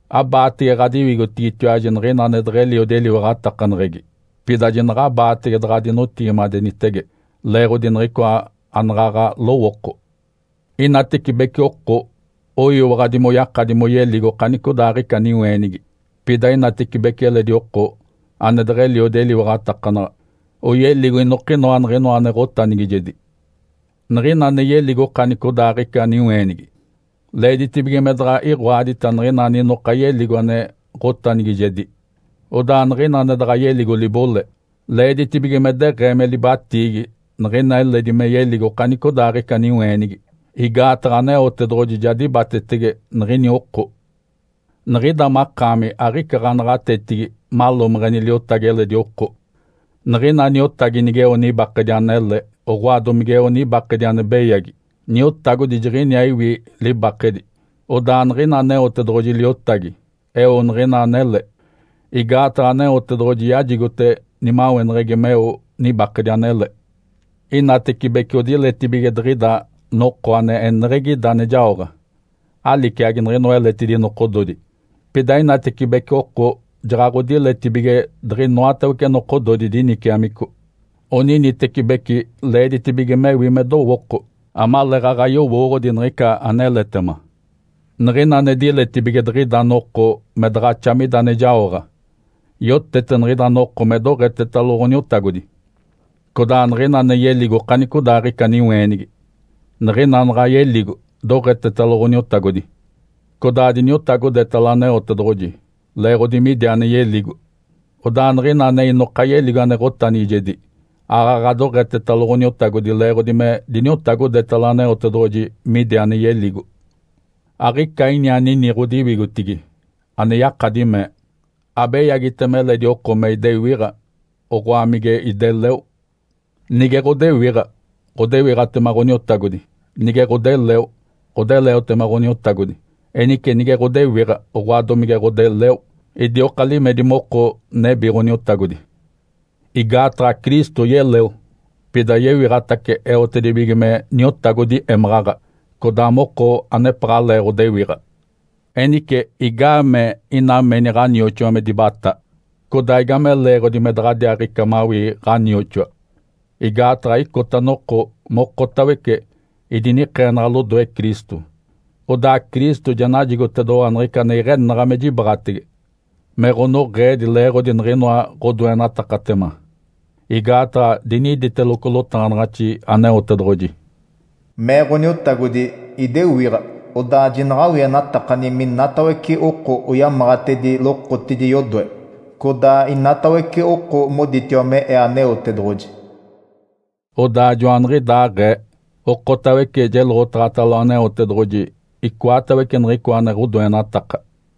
Abaatege ɡ̶adiwigotigitiwaji niɡ̶ina ane deɡ̶eliodi eliwaɡ̶atakaneɡ̶egi. Pida jinaɡ̶abaatege daɡ̶adinotigimadenitege leeɡ̶odi niɡ̶icoa anaɡ̶aɡ̶a lowooko. Inatecibece oko oyiwaɡ̶adi moyakadi moyeligo okanicodaaɡ̶ica niweenigi. Pida inatecibece eledi oko ane deɡ̶eliodi eliwaɡ̶atakanaɡ̶a, oyeligo inokinoa niɡ̶inoa ane ɡ̶otanigijedi. Niɡ̶ina ane yeligo okanicodaaɡ̶ica niweenigi, leeditibige me daɡ̶a iɡ̶oadita niɡ̶ina aninoka yeligo ane ɡ̶otanigijedi. Odaa niɡ̶ina ane daɡ̶a yeligo libole, leeditibige me deɡ̶ee me libatiigi niɡ̶ina eledi me yeligo okanicodaaɡ̶ica niweenigi. Igaataɡ̶a Aneotedoɡ̶oji ja dibatetege niɡ̶ini oko. Niɡ̶ida makaami aɡ̶ica ɡ̶anaɡ̶atetigi malomeɡ̶eni liotagi eledi oko. Niɡ̶ina niotagi, nigeo nibakedi anele, oɡ̶oa, domigeo nibakedi ane beyagi, niotagodi jiɡ̶iniaa iwi libakedi. Odaa niɡ̶ina Aneotedoɡ̶oji liotagi eo niɡ̶ina anele, igaataɡ̶a Aneotedoɡ̶oji yajigote nimaweneɡ̶egi meo nibakedi anele. Inatecibece odiletibige diɡ̶ida noko ane eneɡ̶egi ida ane jaoɡ̶a, aliciagi niɡ̶inoa eletidi nokododi. Pida inatecibece oko jaɡ̶aɡ̶odiletibige diɡ̶inoatawece nokododi diniciamico. Oninitecibeci leeditibige mewi me dowooko amaleeɡ̶aɡ̶a yowooɡ̶odi niɡ̶ica aneletema. Niɡ̶ina ane diletibige diɡ̶ida noko me daɡ̶axa mida ane jaoɡ̶a, yotete niɡ̶ida noko me doɡ̶etetalo Ǥoniotagodi. Codaa niɡ̶ina ane yeligo okanicodaaɡ̶ica niweenigi, niɡ̶ina naɡ̶a yeligo, doɡ̶etetalo Ǥoniotagodi, codaa diniotagodetalo Aneotedoɡ̶oji leeɡ̶odi midi ane yeligo. Odaa niɡ̶ina ane inoka yeligo ane ɡ̶otanigijedi, aaɡ̶aɡ̶a doɡ̶etetalo Ǥoniotagodi leeɡ̶odi me diniotagodetalo Aneotedoɡ̶oji midi ane yeligo. Aɡ̶ica ini anini ɡ̶odiwigotigi ane yakadi mee, “Abeyagitema eledi oko me idewiɡ̶a, oɡ̶oa mige ideleo.” Nige ɡ̶odewiɡ̶a, ɡ̶odewiɡ̶atema Ǥoniotagodi. Nige ɡ̶odeleo, ɡ̶odeleotema Ǥoniotagodi. Enice nige ɡ̶odewiɡ̶a, oɡ̶oa, domige ɡ̶odeleo, idioka limedi moko nebi Ǥoniotagodi. Igaataɡ̶a Cristo yeleo, pida yewiɡ̶atace eotedibige me Niotagodi émaɡ̶aɡ̶a codaa moko anepaɡ̶alee ɡ̶odewiɡ̶a. Enice igaamee ina meni ɡ̶anioxoa me dibatá? Codaa igame leeɡ̶odi me daɡ̶adiaaɡ̶ica mawii ɡ̶anioxoa? Igaataɡ̶a icota noko mokotawece idinikeenaɡ̶a lodoe Cristo. Odaa Cristo ja najigotedoɡ̶owa niɡ̶ica ane iɡ̶enaɡ̶a me jibaɡ̶atege me ɡ̶onoɡ̶eedi leeɡ̶odi niɡ̶inoa ɡ̶odoenatakatema. Igaataɡ̶a diniditeloco lotaɡ̶anaɡ̶axi Aneotedoɡ̶oji, “Mee Ǥoniotagodi, ‘Idewiɡ̶a, odaa jinaɡ̶awienatakani minatawece oko oyamaɡ̶atedi lokotidi yodoe, codaa inatawece oko moditiwa me Ee Aneotedoɡ̶oji.’” Odaa joaniɡ̶idaaɡ̶ee, okotawece jeloɡ̶otaɡ̶atalo Aneotedoɡ̶oji icoatawece niɡ̶icoa ane ɡ̶odoenataka.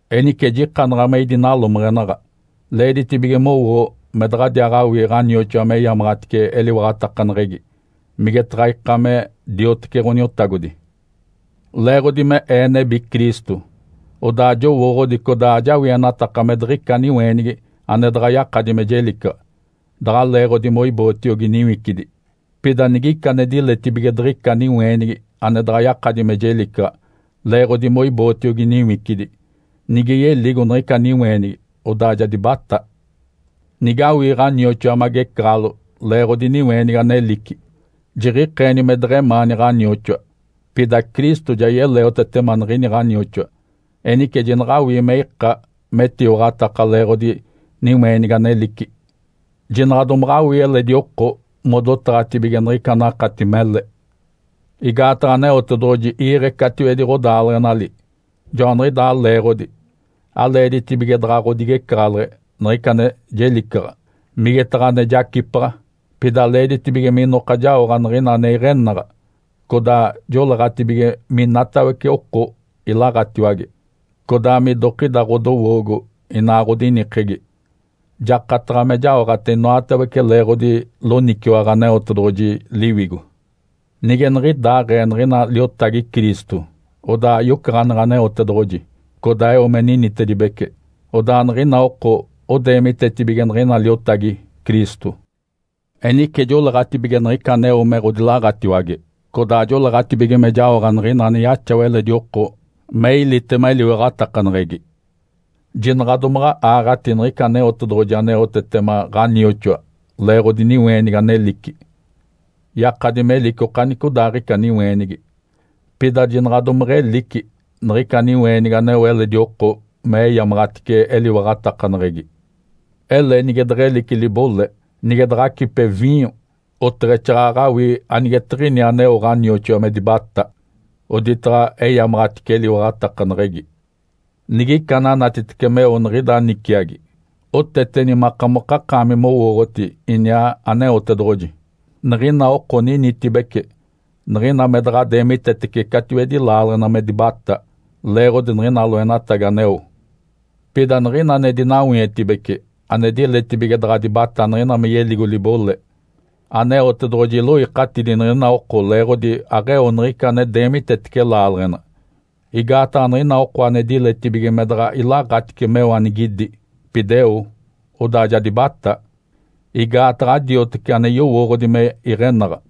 Enice jikanaɡ̶a me idinalomeɡ̶enaɡ̶a. Leeditibige mowoo me daɡ̶adiaaɡ̶awii ɡ̶anioxoa meyamaɡ̶atice eliwaɡ̶atakaneɡ̶egi, migetaɡ̶a ika me diotece Ǥoniotagodi. Leeɡ̶odi me ee nebi Cristo, odaa jowooɡ̶odi codaa ajawienataka me diɡ̶ica niweenigi ane daɡ̶a yakadi me jelicaɡ̶a daɡ̶a leeɡ̶odi moibootiogi niwicidi. Pida nigica ane diletibige diɡ̶ica niweenigi ane daɡ̶a yakadi me jelicaɡ̶a leeɡ̶odi moibootiogi niwicidi, nige yeligo niɡ̶ica niweenigi, odaa ja dibatá. Nigawii ɡ̶anioxoa magecaɡ̶alo leeɡ̶odi niweenigi anelici, jiɡ̶ikeeni me deɡ̶emaani ɡ̶anioxoa. Pida Cristo ja yeleotetema niɡ̶ini ɡ̶anioxoa. Enice jinaɡ̶awii me ika metiwaɡ̶ataka leeɡ̶odi niweenigi anelici. Jinaɡ̶a domaɡ̶awii eledi oko modotaɡ̶atibige niɡ̶ica anakati mele. Igaataɡ̶a Aneotedoɡ̶oji iiɡ̶e catiwedi ɡ̶odaaleɡ̶enali. Joaniɡ̶idaa leeɡ̶odi aleeditibige daɡ̶a ɡ̶odigecaɡ̶aleɡ̶e niɡ̶ica ane jelicaɡ̶a, migetaɡ̶a ane jacipaɡ̶a. Pida leeditibige minoka jaoɡ̶a niɡ̶ina ane iɡ̶enaɡ̶a, codaa joleeɡ̶atibige minatawece oko ilaɡ̶atiwage, codaa midokida ɡ̶odowoogo inaa ɡ̶odinikegi. Jakataɡ̶a me jaoɡ̶ate inoatawece leeɡ̶odi loniciwaɡ̶a Aneotedoɡ̶oji Liwigo. Nige niɡ̶idaaɡ̶ee niɡ̶ina liotagi Cristo, odaa yocaɡ̶aneɡ̶e Aneotedoɡ̶oji, codaa eo me ninitedibece. Odaa niɡ̶ina oko odeemitetibige niɡ̶ina liotagi Cristo. Enice joleeɡ̶atibige niɡ̶ica aneo me ɡ̶odilaɡ̶atiwage, codaa joleeɡ̶atibige me jaoɡ̶a niɡ̶ina ane yaxawa eledi oko me ilitema eliwaɡ̶atakaneɡ̶egi. Jinaɡ̶a domaɡ̶a aaɡ̶ati niɡ̶ica Aneotedoɡ̶oji aneotetema ɡ̶anioxoa leeɡ̶odi niweenigi anelici. Yakadi melici okanicodaaɡ̶ica niweenigi, pida jinaɡ̶a domeɡ̶elici niɡ̶ica niweenigi aneo eledi oko me eyamaɡ̶atice eliwaɡ̶atakaneɡ̶egi. Ele nige deɡ̶elici libole, nige daɡ̶a acipe viinyo, oteɡ̶exaaɡ̶aɡ̶a awii anigetiɡ̶ini aneo ɡ̶anioxoa me dibatá, oditaɡ̶a eyamaɡ̶atice eliwaɡ̶atakaneɡ̶egi. Nigica ananatitece meo niɡ̶ida niciagi, oteteni makamokakaami mowooɡ̶oti iniaa Aneotedoɡ̶oji. Niɡ̶ina oko ninitibece, niɡ̶ina me daɡ̶a deemitetece catiwedi laaleɡ̶ena me dibatá leeɡ̶odi niɡ̶ina loenatagi aneo. Pida niɡ̶ina ane dinawietibece, ane diletibige daɡ̶a dibatá niɡ̶ina me yeligo libole, Aneotedoɡ̶oji iloikatidi niɡ̶ina oko leeɡ̶odi aɡ̶eo niɡ̶ica ane deemitetece laaleɡ̶ena. Igaataɡ̶a niɡ̶ina oko ane diletibige me daɡ̶a ilaɡ̶atice meo anigidi, pida eo, odaa ja dibatá (igaataɡ̶a adioteci ane yowooɡ̶odi me iɡ̶enaɡ̶a).